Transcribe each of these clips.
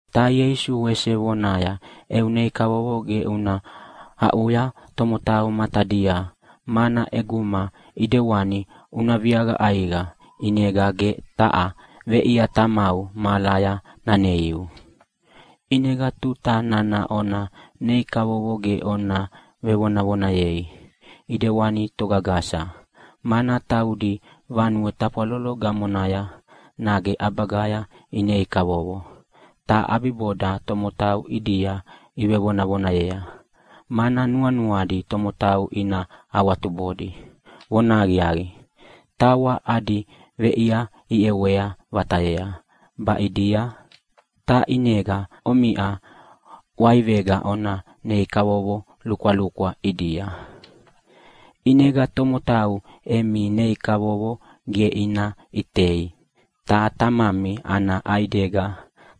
Ta Ieisu wese vonaya, “Eu nei kavovo ge una aʼuya tomotau matadia, mana ʼeguma ʼidewani una viaqa ʼaiqa ʼinega ge taha veʼia Tamau mahalaya naneiu. ʼInega tuta nana ona nei kavovo ge ona vevonavonayei ʼidewani togagasa, mana taudi vanue tafwalolo gamonaya nage ʼabagaya ineinei kavovo, ta ʼabiboda tomotau ʼidia ivonavonayea, mana nuanuadi tomotau ina awatubodi. Vonahaqiaqi, tawa adi veʼia iʼewa vatayea baʼidia. Ta ʼinega omiʼa ʼwaivega ona nei kavovo lukwalukwa ʼidia. ʼInega tomotau emi nei kavovo ge ina ʼitei, ta Tamami ana ʼaidega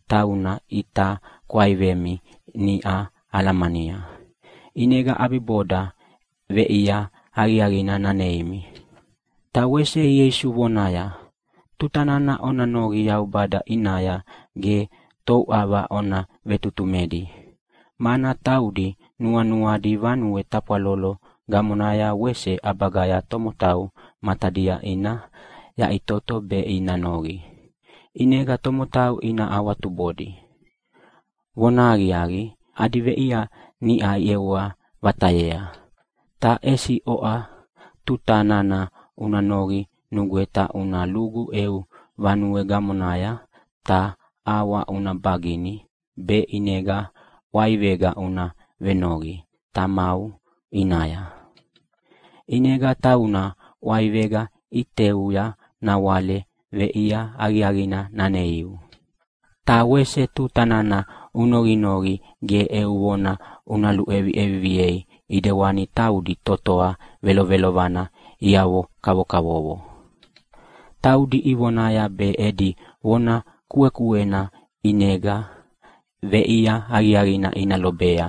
tauna ʼita kwaivemi niʼa alamania, ʼinega ʼabiboda veʼia aqiaqina naneimi.” Ta wese Ieisu vonaya, “Tuta nana ona noqi Yaubada ʼinaya ge touʼava ona vetutumedi, mana taudi nuanuadi vanue tafwalolo gamonaya wese ʼabagaya tomotau matadia ina yaʼitoto be ina noqi, ʼinega tomotau ina awatubodi. Vonahaqiaqi, adi veʼia niʼa iʼewa vatayea. “Ta ʼesi oʼa, tuta nana una noqi nugweta una lugu eu vanue gamonaya ta ʼawa una bagini, be ʼinega ʼwaivega una venoqi Tamau ʼinaya. ʼInega tauna ʼwaivega ʼiteuya nawale veʼia aqiaqina naneiu. Ta wese tuta nana unoqinoqi ge eu vona una luʼeviʼeviviei ʼidewani taudi totoa velovelovana iavoavo kavokavovo. Taudi ivonaya be edi vona kuekuena ʼinega veʼia aqiaqina ina lobea.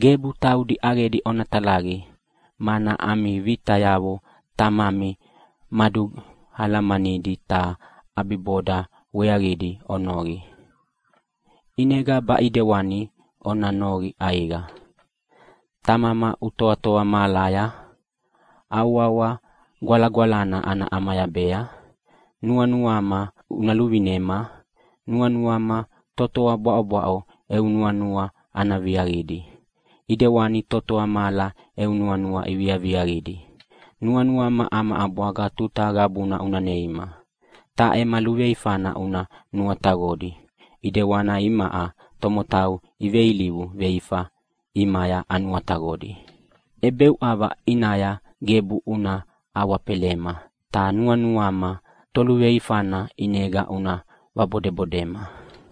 Gebu taudi ʼaqedi ona talaqi, mana ami vitayavo Tamami madualamanidi ta ʼabiboda weaqidi onoqinoqi. “ʼInega baʼidewani ona noqi ʼaiqa: Tamama, utoatoa mahalaya. Au wawa gwalagwalana ana ʼamayabea. Nuanuama una luvinema. Nuanuama totoa bwaʼobwaʼo eu nuanua ana viaqidi, ʼidewani totoa mahala eu nuanua iviaviaqidi. Nuanuama ama ʼabwaga tuta qabuna una neima. Ta ema luveifana una nuataqodi, ʼidewani imaʼa tomotau iveilivu veifa ʼimaya anuataqodi. ʼEbeuʼava ʼinaya gebu una awafelema, ta nuanuama toluveifana ʼinega una vabodebodema.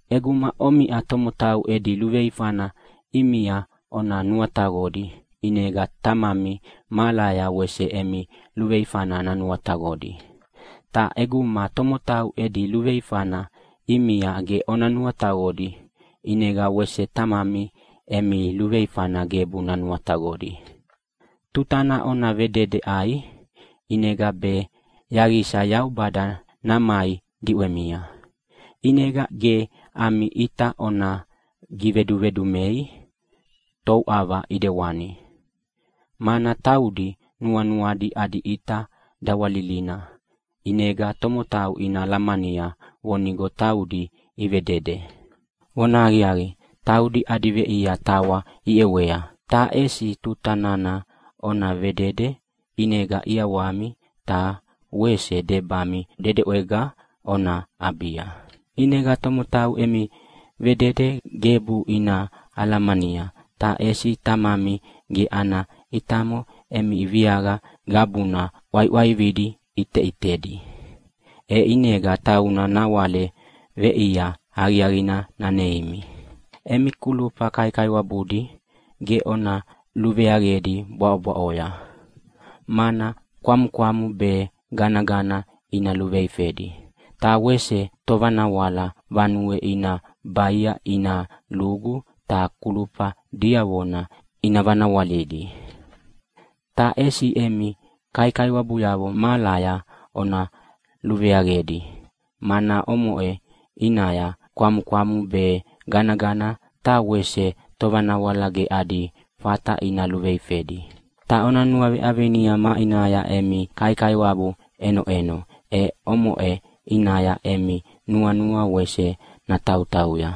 ʼEguma omiʼa tomotau edi luveifana ʼimia ona nuataqodi ʼinega Tamami mahalaya wese emi luveifana nanuataqodi. Ta ʼeguma tomotau edi luveifana ʼimia ge ona nuataqodi ʼinega wese Tamami emi luveifana gebu nanuataqodi. “Tuta nana ona vedede ʼai ʼinega be yaqisa Yaubada namai diʼwemia, ʼinega ge ami ʼita ona givedumedumei touʼava ʼidewani, mana taudi nuanuadi adi ʼita dawalilina ʼinega tomotau ina alamania vonigo taudi ivevedede. Vonahaqiaqi, taudi adi veʼia tawa iʼewea. Ta ʼesi tuta nana ona vedede ʼinega ʼiawami ta wese debami dedeʼwega ona ʼabia, ʼinega tomotau emi vedede gebu ina alamania, ta ʼesi Tamami ge ana ʼitamo emi viaqa qabuna ʼwaiʼwaividi ʼiteʼitedi, e ʼinega tauna nawale veʼia aqiaqina naneimi. “Emi kulufa kaikaiwabudi ge ona luveaqedi bwaʼobwaʼoya, mana kwamukwamu be ganagana ina luveifedi, ta wese tovanawala vanue ina baia ina lugu ta kulufa diavona ina vanawalidi. Ta ʼesi emi kaikaiwabuyavo mahalaya ona luveaqedi, mana omoʼe ʼinaya kwamukwamu be ganagana ta wese tovanawala ge adi fata ina luveifedi. Ta ona nuaveʼavinia maʼinaya emi kaikaiwabu ʼenoʼeno, e omoʼe ʼinaya emi nuanua wese natautauya.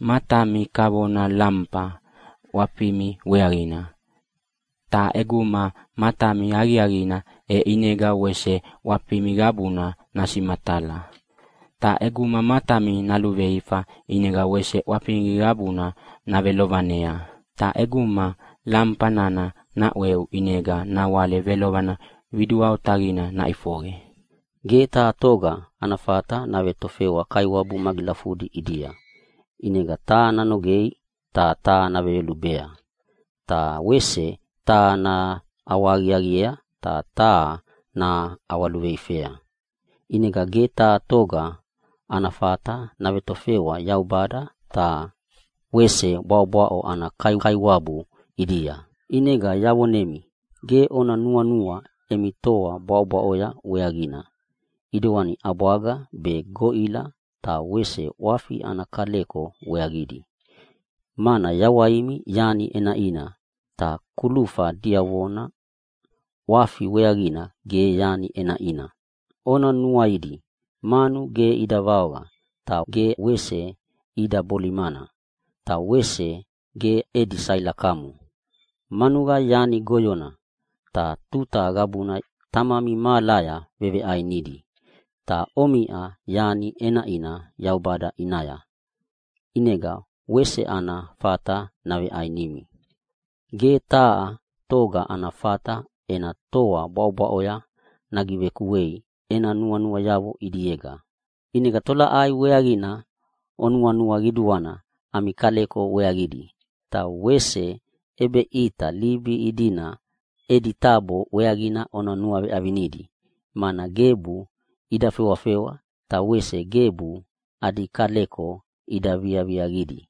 “Matami kavona lamufa ʼwafimi weaqina. Ta ʼeguma matami aqiaqidi, e ʼinega wese ʼwafimi qabuna nasimatala. Ta ʼeguma matami naluveifa ʼinega wese ʼwafimi qabuna navelovanea. Ta ʼeguma lamufa nana naʼweu ʼinega nawale velovana qidua otaqina naʼifoqe. “Ge taha toga ana fata navetofewa kaiwabu magilafudi ʼidia. ʼInega taha nanogei ta taha naveyolubea. Ta wese taha naʼawahaqiaqiea ta taha naʼawaluveifea. ʼInega ge taha toga ana fata navetofewa Yaubada ta wese bwaʼobwaʼo ana kaikaiwabu ʼidia. “ʼInega yavonemi, ge ona nuanua emi toa bwaʼobwaʼoya weaqina, ʼidewani ʼabwaga be goʼila ta wese ʼwafimi ana kaleko weaqidi. Mana yawaimi yani ʼenaʼina, ta kulufa diavona ʼwafi weaqina ge yani ʼenaʼina. Ona nuaidi manu, ge ida vaoqa, ta ge wese ida bolimana, ta wese ge edi sailakamo. Manuqa yani goyona, ta tuta qabuna Tamami mahalaya veveʼainidi. Ta omiʼa yani ʼenaʼina Yaubada ʼinaya, ʼinega wese ana fata naveʼainimi. “Ge taha toga ana fata ena toa bwaʼobwaʼoya nagivekuei ena nuanuayavo ʼidiega. ʼInega tolaʼai weaqina onuanua qiduana ami kaleko weaqidi? Taha wese ʼebeʼita libi idina edi tabo weaqina ona nuaʼivinidi, mana gebu ida fewafewa ta wese gebu adi kaleko ida viaviaqidi.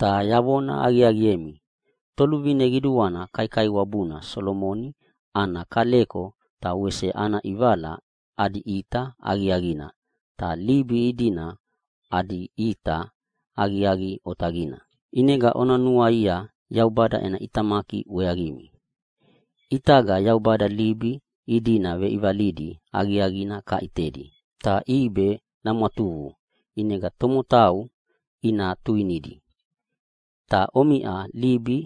Ta yavona aqiaqiemi, toluvine qiduana kaikaiwabuna Solomoni ana kaleko ta wese ana ʼivala adi ʼita aqiaqina, ta libi idina adi ʼita aqiaqi otaqina. ʼInega ona nuaia Yaubada ena ʼitamaki weaqimi. ʼItaga Yaubada libi idina veʼivalidi aqiaqina kaʼitedi, ta ʼibe namwatuqu ʼinega tomotau ina tuinidi. Ta omiʼa libi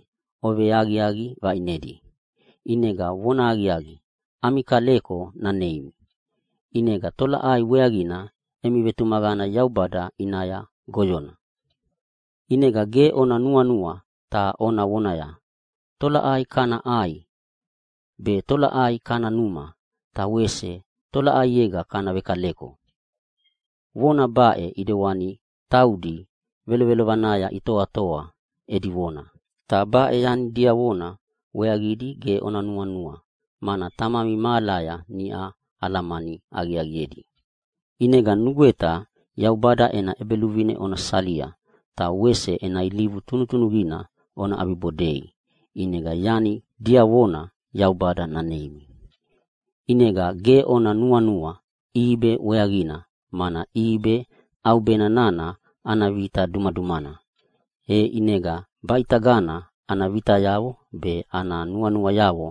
oveaqiaqi vaʼinedi, ʼinega vonahaqiaqi ami kaleko naneimi. ʼInega tolaʼai weaqina emi vetumaqana Yaubada ʼinaya goyona? “ʼInega ge ona nuanua ta ona vonaya, ‘Tolaʼai kana ʼai, be tolaʼai kana numa ta wese tolaʼaiega kana vekaleko?’ Vona baʼena ʼidewani taudi velovelovanaya itoatoa edi vona. Ta baʼe yani diavona weaqidi ge onuanua, mana Tamami mahalaya niʼa alamani aqiaqiedi. ʼInega nugweta Yaubada ena ʼEbeluvine ona salia ta wese ena ilivu tunutunuqina ona ʼabibodei ʼinega yani diavona Yaubada naneimi. “ʼInega ge ona nuanua ʼibe weaqina, mana ʼibe ʼaubena nana ana vita dumadumana, e ʼinega baʼitagana ana vitayavo be ana nuanuayavo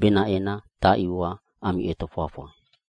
benaʼe taʼiwa ami ʼetofwafwa.